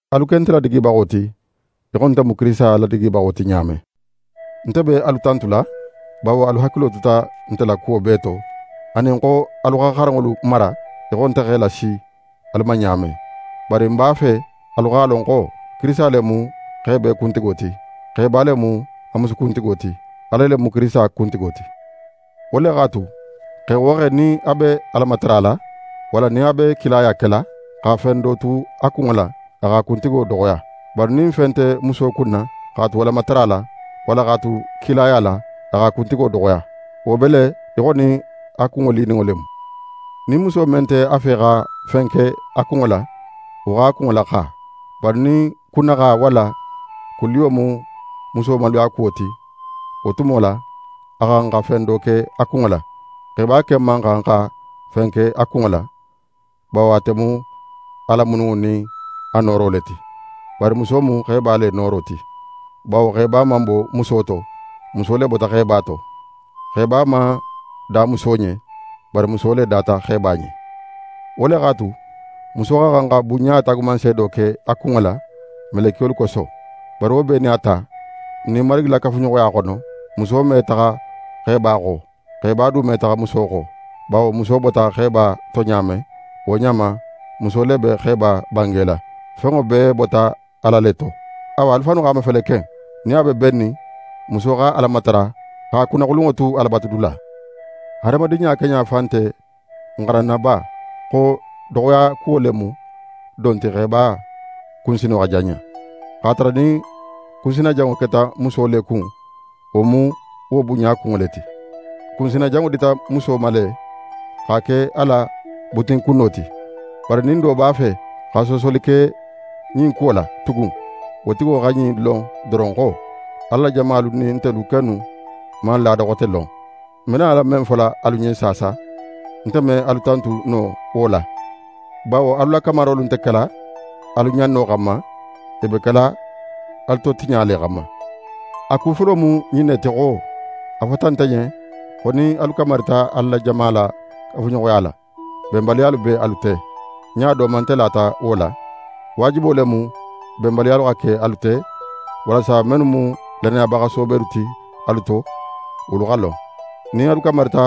Alu ke nte ladigibaxo ti í xo nte mu Kirisita ladigibaxo ti ɲa men. Nte be alu tantula bawo alu hakilo tuta nte la kuwo bee to, anin xo alu xa xaranŋolu mara í xo nte x'e lasi alu ma ɲa men. Bari ń b'a fe alu x'a lon xo: Kirisita le mu xe bee kuntigo ti; xeba le mu a musu kuntigo ti, Ala le mu Kirisita kuntigo ti. Wo le x'a tu, xe wo xe nin a be Ala matarala, walla nin a be kilaya kela, xa fen do tu a kunŋo la, a x'a kuntigo doxoya. Bari nin fen nte muso kunna x'a tu Alamatara la, walla x'a tu kilaya la, a x'a kuntigo doxoya. Wo be le í xo nin a kunŋo lininŋo le mu. Nin muso men nte a fe xa fen ke a kunŋo la, wo x'a kunŋo laxa. Bari nin kunnaxa walla kun liyo mu muso maluyakuwo ti, wo tumo la, a xa xan xa fen do ke a kunŋo la. Xeba ken man xan xa fen ke a kunŋo la; bawo ate mu Ala mununŋo nin a nooro le ti. Bari muso mu xeba le nooro ti; bawo xeba man bo muso to; muso le bota xeba to. Xeba man da muso ɲen, bari muso le data xeba ɲen. Wo le x'a tu, muso xa xan xa bunɲa taagumanseedo ke a kunŋo la, melekiyolu koso. Bari wo bee nin a ta, n nin Marigi la kafuɲoxoya xono, muso me taxa xeba xo, xeba du me taxa muso xo. Bawo muso bota xeba to ɲa men, wo ɲa ma, muso le be xeba bangela. Fenŋo bee bota Ala le to. Awa, alu fannu x'a mafele ken, nin a be bennin muso xa Ala matara, x'a kunnaxulunŋo tu Alabatudula. Hadamadinɲa keɲa fan nte n xaranna ba xo doxoyakuwo le mu don ti xeba kunsino xa janɲa? X'a tara nin kunsinajanŋo keta muso le kun, wo mu wo bunɲa kunŋo le ti. Kunsina janŋo dita le muso ma x'a ke a la butinkunno ti. Bari nin do b'a fe xa soosoli ke ɲin kuwo la tugun, wo tigo xa ɲin lon doron xo: Ala la jamalu nin ntelu kennu man laada xote lon. Ń be nala men fola alu ɲen saasa, nte me alu tantu no wo la; bawo alu la kamarolu nte kela alu ɲanno xanma, i be kela alu totiɲa le xanma. A ku folo mu ɲin ne ti xo, a fota nte ɲen xo nin alu kamarita Ala la jama la kafuɲoxoya la, benbaliyalu be alu te. Ɲa do ma nte lata wo la. Waajibo le mu benbaliya xa ke alu te, walasa mennu mu lannayabaxa soobelu ti alu to, wolu xa lon. Nin alu kamarita,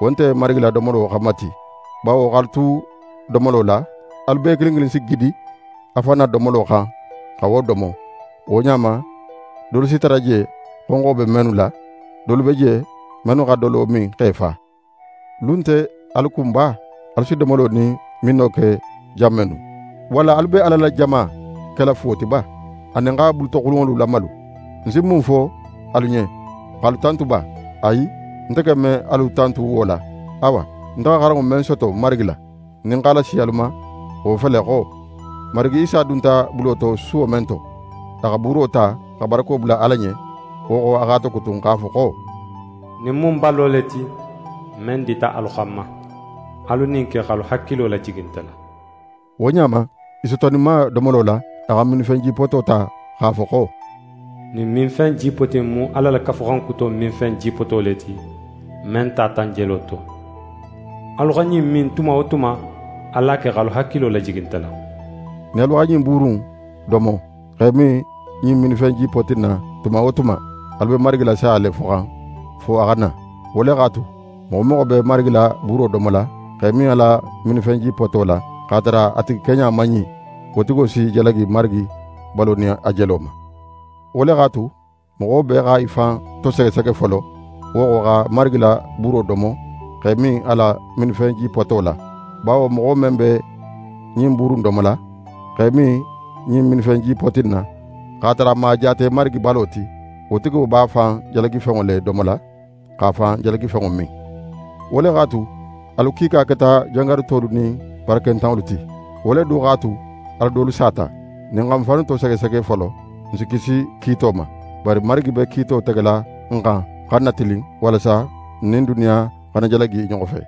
wo nte Marigi la domolo xanma ti; bawo x'alu tu domolo la, alu bee kilin kilin si gidi a fan na domolo xan xa wo domo. Wo ɲa ma, dolu si tara je xonxo be mennu la. Dolu be je mennu xa dolo min x'e fa. Lu nte alu kun ba alu si domolo nin minno ke jan mennu? Walla alu be Ala la jama kela fuwo ti ba, anin xa bulutoxulunŋolu lamalu? Ń si mun fo alu ɲen? X'alu tantu ba? Ayi, nte ken me alu tantu wo la. Awa, nte xa xaranŋo men soto Marigi la, nin ń x'a lasi alu ma, wo fele xo: Marigi Isa dunta bulo to suwo men to, a xa buuro ta, xa barako bula Ala ɲen. Wo xo, a x'a tokutun, x'a fo xo: «Ɲin mu ń balo le ti, men dita alu xanma. Alu ɲin ke x'alu hakilo lajigi nte la.» Wo ɲa ma, i sotoninma domolo la, a xa minfen jipoto ta, x'a fo xo: «Ɲin minfen jipoti in mu Ala la Kafuxan Kuto minfen jipoto le ti, men tata ń jelo to. Alu xa ɲin min tuma wo tuma, alu a ke x'alu hakilo lajigi nte la.» Nin alu xa ɲin buuru in domo, x'e min ɲin minfen jipoti in na tuma wo tuma, alu be Marigi la saya le foxan, fo a xa na. Wo le x'a tu, moxo wo moxo be Marigi la buuro domola, x'e min a la minfen jipoto la, x'a tara a tigi keɲa man ɲin, wo tigo si jalagi Marigi balo nin a jelo ma. Wo le x'a tu, moxo bee xa í fan tosegesege folo, wo xo, xa Marigi la buuro domo, x'e min a la minfen jipoto la. Bawo moxo men be ɲin buuru in domola, x'é min ɲin minfen jipoti in na, x'a tara a man a jaate Marigi balo ti, wo tigo b'a fan jalagifenŋo le domola, x'a fan jalagifenŋo min. Wo le x'a tu, alu kiika keta jangarutolu nin barakentanŋolu ti. Wo le du x'a tu, alu dolu sata. Nin n xa n fannu tosegesege folo, n si kisi kiito ma. Bari Marigi be kiito tegela n xan xa n natilin, walasa n nin duniya xana jalagi i ɲoxo fe.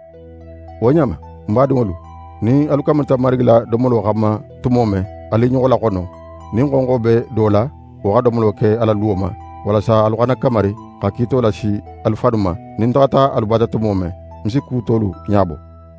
Wo ɲa ma, ń badinŋolu, nin alu kamarita Marigi la domolo xanma tumo men, alu i ɲoxo laxono. Nin xonxo be do la, wo xa domolo ke a la luwo ma, walasa alu xana kamari xa kiito lasi alu fannu ma. Nin ń taxata alu bata tumo men, ń si ku tolu ɲabo.